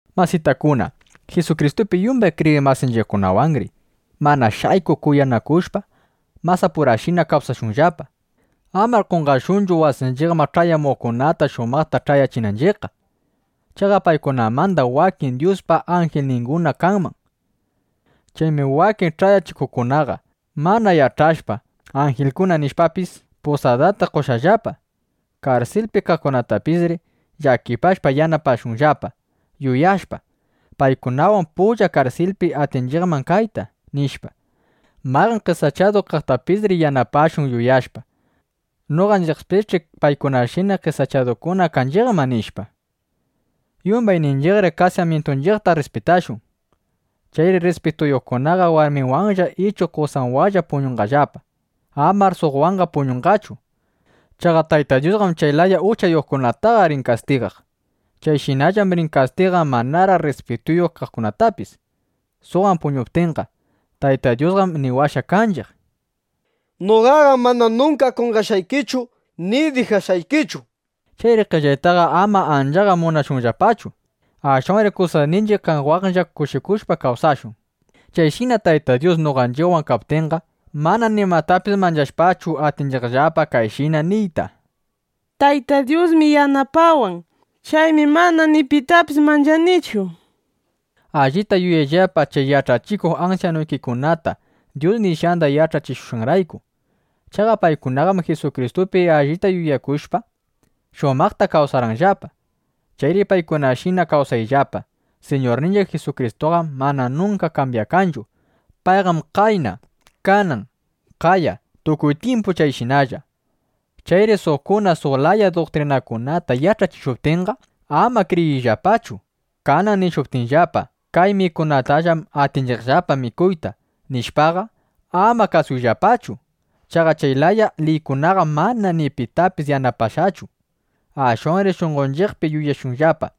Masitakuna, Jisukristupi yumbay kriyiq masinchiqwanri mana shaykuq kuyanakushpa masapurashina kawsashunllapa. Amar qonqashunchu wasinchiqman ch'ayamuqkunata shumaqta ch'ayachinanchiqqa. Chaqa paykunamanda wakinqam Dyuspa anjilninguna kanman. Chaymi wakin ch'ayachiqkunaqa mana yach'ashpa, anjilkuna nishpapis, pusadata qoshqallapa. Karsilpi kaqkunatapisri llakipashpa yanapashunllapa, yuyashpa: Paykunawan pulla karsilpi atinchiqman kayta, nishpa. Mayqan qesachadu kaqtapisri yanapashun, yuyashpa: Noqanchiqpisch'i paykunashina qesachadukuna kanchiqman, nishpa. Yumbayninchiqri kasamyintunchiqta rrispitashun. Chayri rrispituyuqkunaqa warminwanlla ichu qosanwanlla puñunqallapa. Amar suqwanqa puñunqachu. Chaqa Tayta Dyusqam chay laya uchayuqkunataqa rin kastigaq. Chayshinallam rin kastigaq manaraq rrispituyuq kaqkunatapis, suqwan puñuptinqa. Tayta Dyusqam niwashqa kanchiq: “Noqaqam mana nunka qonqashqaykichu ni dijashqaykichu”, nishpa. Chayri qellaytaqa ama anchaqa munashunllapachu. Ashwanri kusasninchiq kaqwanlla kushikushpa kawsashun. Chayshina Tayta Dyus noqanchiqwan kaptinqa, mana nimatapis manchashpachu, atinchiqllapa kayshina niyta: Tayta Dyusmi yanapawan. Chaymi mana ni pitapis manchanichu, nishpa. Allita yuyayllapa chay yach'achikuq ansyanuykikunata, Dyus nishqanda yach'achishushqanrayku. Chaqa paykunaqam Jisukristupi allita yuyakushpa, shumaqta kawsarqanllapa. Chayri paykunashina kawsayllapa. Siñurninchiq Jisukristuqam mana nunka kambyakanchu. Payqam qayna, kanan, qaya, tukuy tyimpu chayshinalla. Chayri suqkuna suq laya duktrinakunata yach'achishuptinqa, ama kriyiyllapachu. Kanan nishuptinllapa: “Kay mikunakunatallam atinchiqllapa mikuyta”, nishpaqa, ama kasuyllapachu. Chaqa chay laya liykunaqam mana ni pitapis yanapashqachu. Ashwanri shunqonchiqpi yuyashunllapa: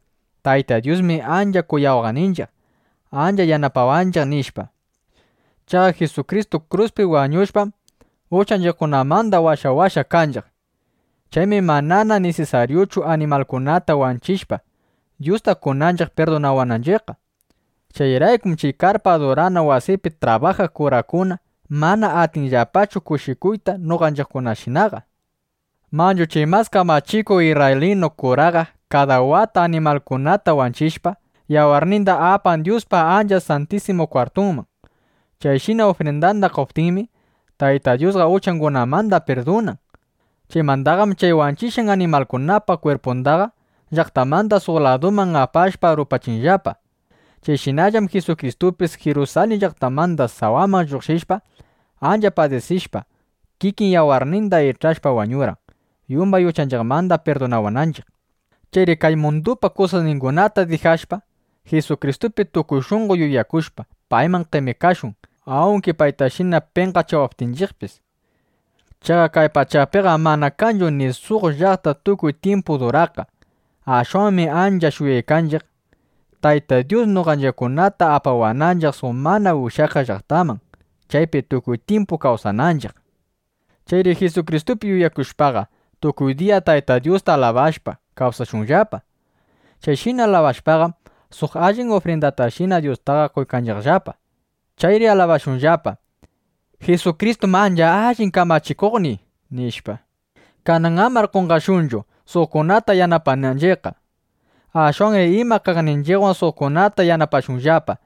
Tayta Dyusmi ancha kuyawaqninchiq, ancha yanapawanchiq, nishpa. Chaqa Jisukristu kruspi wañushpam, uchanchiqkunamanda washawashqa kanchiq. (Chaymi manana nisisaryuchu animalkunata wanchishpa, Dyusta qonanchiq pirdunawananchiqqa.) Chayraykum chay karpa adurana wasipi trabajaq kurakuna mana atinllapachu kushikuyta noqanchiqshinaqa. Manchu chay mas kamachikuq isrraylinu kuraqa kada wata animalkunata wanchishpa, yawarninda apan Dyuspa Ancha Santisimu Kwartunman. Chayshina ufrindanda qoptinmi, Tayta Dyusqa uchangunamanda pirdunan. Chaymandaqam chay wanchishqan animalkunapa kwirpundaqa llaqtamanda suq laduman apashpa, rupachinllapa. Chayshinallam Jisukristupis Jirusalin llaqtamanda sawaman lluqshishpa, ancha padisishpa, kikin yawarninda ich'ashpa, wañurqan, yumbay uchanchiqmanda pirdunawananchiq. Chayri kay mundupa kusasningunata dijashpa, Jisukristupi tukuy shunqo yuyakushpa, payman qemikashun, awnki paytashina penqachiwaptinchiqpis. Chaqa kay pachapiqam mana kanchu ni suq llaqta tukuy tyimpu duraqqa. Ashwanmi ancha shuyaykanchiq, Tayta Dyus noqanchiqkunata apawananchiq suq mana ushyakaq llaqtaman, chaypi tukuy tyimpu kawsananchiq. Chayri Jisukristupi yuyakushpaqa, tukuy diya Tayta Dyusta alabashpa, kawsashunllapa. Chayshina alabashpaqam, suq allin ufrindatashina Dyustaqa qoykanchiqllapa. Chayri alabashunllapa: “Jisukristum ancha allin kamachikuqniy”, nishpa. Kanan amar qonqashunchu, suqkunata yanapananchiqqa. Ashwanri ima kaqninchiqwan suqkunata yanapashunllapa.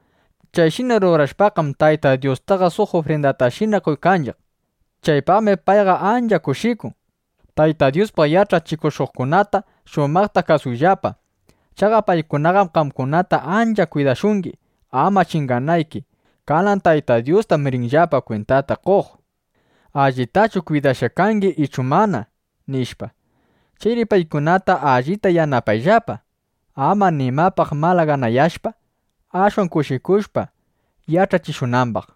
Chayshina rurashpaqam, Tayta Dyustaqa suq ufrindatashina qoykanchiq. Chaypaqmi payqa ancha kushikun. Tayta Dyuspaq yach'achishuqkunata shumaqta kasuyllapa. Chaqa paykunaqam qamkunata ancha kwidashungi, ama chinganayki. Kanan Tayta Dyustam rinllapa kwintata qoq: ¿Allitachu kwidashqa kangi ichu mana? nishpa. Chayri paykunata allita yanapayllapa, ama nimapaq malaganayashpa, ashwan kushikushpa yach'achishunambaq.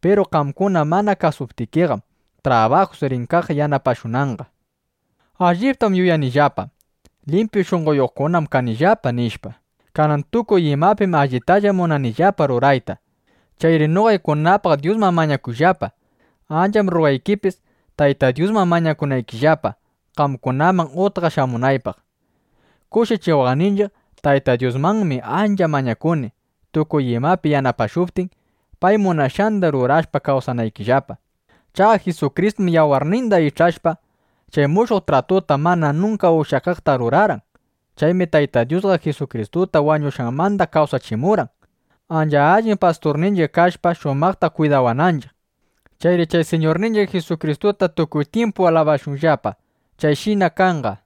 Piru qamkuna mana kasuptikiqam, trabajus rin kaq yanapashunanqa. Alliptam yuyanillapa: Limpyu shunqoyuqkunam kanillapa, nishpa. Kanan tukuy imapim allitalla munanillapa rurayta. Chayri noqaykunapaq Dyusman mañakuyllapa. Ancham rrugaykipis, Tayta Dyusman mañakunaykillapa, qamkunaman utqa shamunaypaq. Kushichiwaqninchiq Tayta Dyusmanmi ancha mañakuni, tukuy imapi yanapashuptin, pay munashqanda rurashpa kawsanaykillapa. Chaqa Jisukristum yawarninda ich'ashpa, chay mushuq tratu mana nunka ushyakaqta rurarqan. Chaymi Tayta Dyusqa Jisukristuta wañushqanmanda kawsachimurqan, ancha allin Pasturninchiq kashpa, shumaqta kwidawananchiq. ¡Chayri chay Siñurninchiq Jisukristuta tukuy tyimpu alabashunllapa! ¡Chayshina kanqa!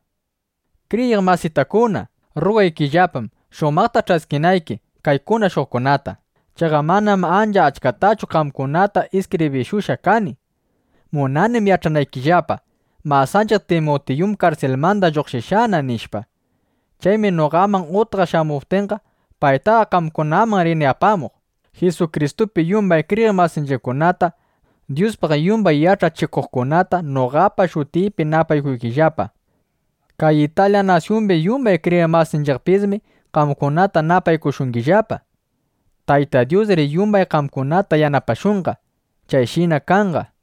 Kriyiq masitakuna, rrugaykillapam, shumaqta ch'askinayki kay kunashushqayta. Chaqa manam ancha achkatachu qamkunata iskibrishushqa kani. Munanim yach'anaykillapa: Masanchiq Timutiyum karsilmanda lluqshishqana, nishpa. Chaymi noqaman utqa shamuptinqa, paytaqa qamkunaman rini apamuq. Jisukristupi yumbay kriyiq masinchiqkunata, Dyuspaq yumbay yach'achikuqkunata noqapa shutiypi napaykuyllapa. Kay Italya nasyumbi yumbay kriyiq masinchiqpismi qamkunata napaykushungillapa. Tayta Dyusri yumbay qamkunata yanapashunqa. Chayshina kanqa.